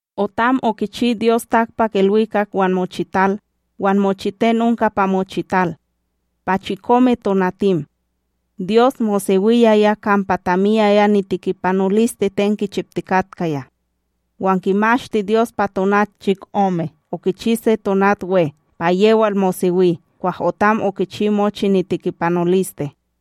Otam okichi Dyos takpakIlwikak wan mochital, wan mochiten onka pa mochital. Pa chikome tonatim, Dyos mosewiyaya kampa tamiyaya nitikipanoliste ten kichiptikatkaya. Wan kimashti Dyos pa tonat chikome, okichi se tonat we, pa yewal mosewi kwah otam okichi mochi nitikipanoliste.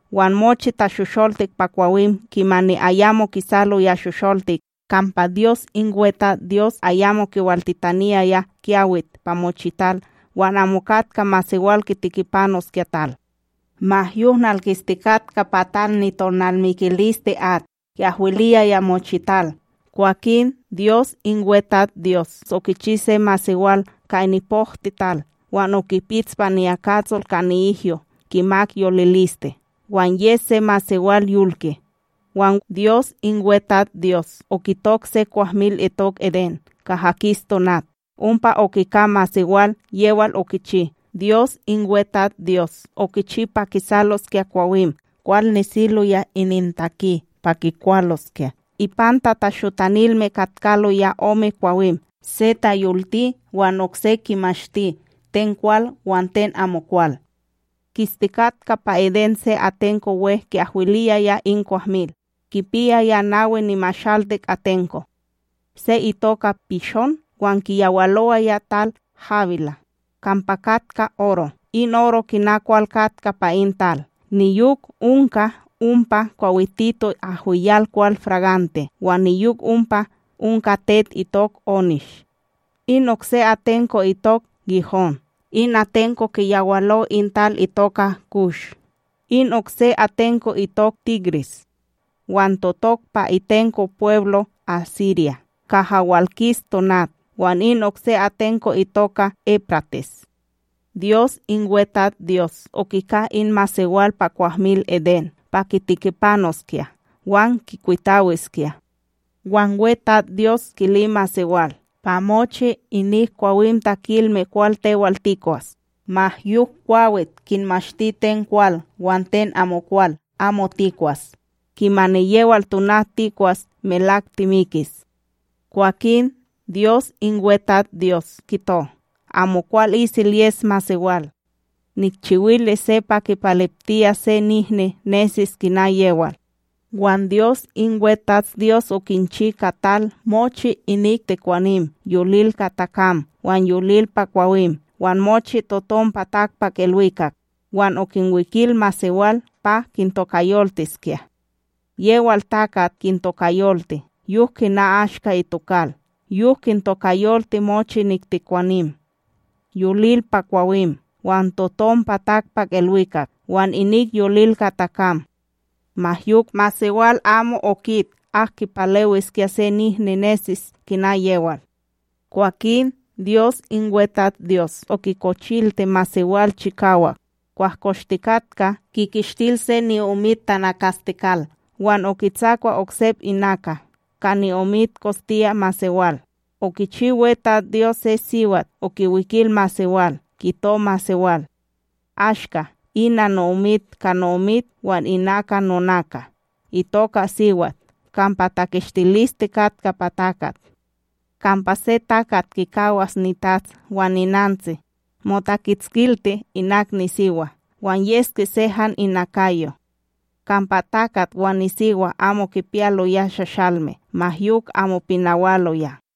wan mochi tashosholtik pa kwawim kimani ayamo kisaloya shosholtik, kampa Dyos in WeTatsDyos ayamo kiwaltitaniyaya kyawit pa mochital wan amo katka masewal kitikipanoskya tal. Ma yok, nalkistikatka pa tal nitonalmikiliste at ki'ahwiliyaya mochital. Kwakin Dyos in WeTatsDyos okichi se masewal ka nipohtiTal, wan okipits pa niyakatsol ka ni'ihyo kimak yoliliste, wan ye se masewal yolke. Wan Dyos in WeTatsDyos okitok se kwahmil itok Edén kaha kis tonat, ompa okika masewal yewal okichi. Dyos in WeTatsDyos okichi pa kisaloskya kwawim kwal nesiloya inintaki pa kikwaloskya. Ipanta tashotanilme katkaloya ome kwawim, se tayolti, wan okse kimashti ten kwal wan ten amokwal. Kistikatka pa Edén se atenko we ki'ahwiliyaya in kwahmil, kipiyaya nawi nimashaltik atenko. Se itoka Pishón, wan kiyawalowaya tal Hawilá, kampa katka oro. In oro kina kwal katka pa in tal, niyok onka ompa kwawitito ahwiyal kwal fragante wan niyok ompa onka tet itok onish. In okse atenko itok Gihón, in atenko kiyawalo in tal itoka Kush. In okse atenko itok Tigris, wan totok pa itenko pweblo Asirya kaha walkis tonat. Wan in okse atenko itoka Éprates. Dyos in WeTatsDyos okika in masewal pa kwahmil Edén pa kitikipanoskya wan kikwitawiskya, wan WeTatsDyos kili masewal: “Pa mochi inik kwawim takilme kwal tewal tikwas, ma yok kwawit kinmashti ten kwal wan ten amokwal amo tikwas, kimani yewal tonat tikwas melak timikis.” Kwakin Dyos in WeTatsDyos kito: “Amokwal isel yes masewal. Nikchiwilis se pa kipaleptiyas se nihni nesis kina yewal.” Wan Dyos in WeTatsDyos okinchi ka tal mochi inik tekwanim yolil ka takam wan yolil pa kwawim wan mochi totom pa takpakIlwikak, wan okinwikil masewal pa kintokayoltiskya. Yewal takat kintokayolti, yok kina ashka itokal. Yok kintokayolti mochi inik tekwanim yolil pa kwawim, wan totom pa takpakIlwikak wan inik yolil ka takam. Ma yok, masewal amo okit ak kipalewiskya se nihni nesis kina yewal. Kwakin Dyos in WeTatsDyos okikochilti masewal chikawak, kwah koshtikatka, kikishtil se ni'omita tanakastekal wan okitsakwa oksep inaka. Ka ni'omit kostiya masewal, okichi WeTatsDyos se siwat okiwikil masewal, kito masewal: “Ashka, ina no'omit ka no'omit wan inaka nonaka. Itoka siwat kampa takishtiliste katka pa takat.” Kampa se takat kikawas nitats wan ninantsi, motakitskilti inak nisiwa, wan yeske se han inakayo. Kampa takat wan nisiwa amo kipiyaloya shashalme, ma yok amo pinawaloya.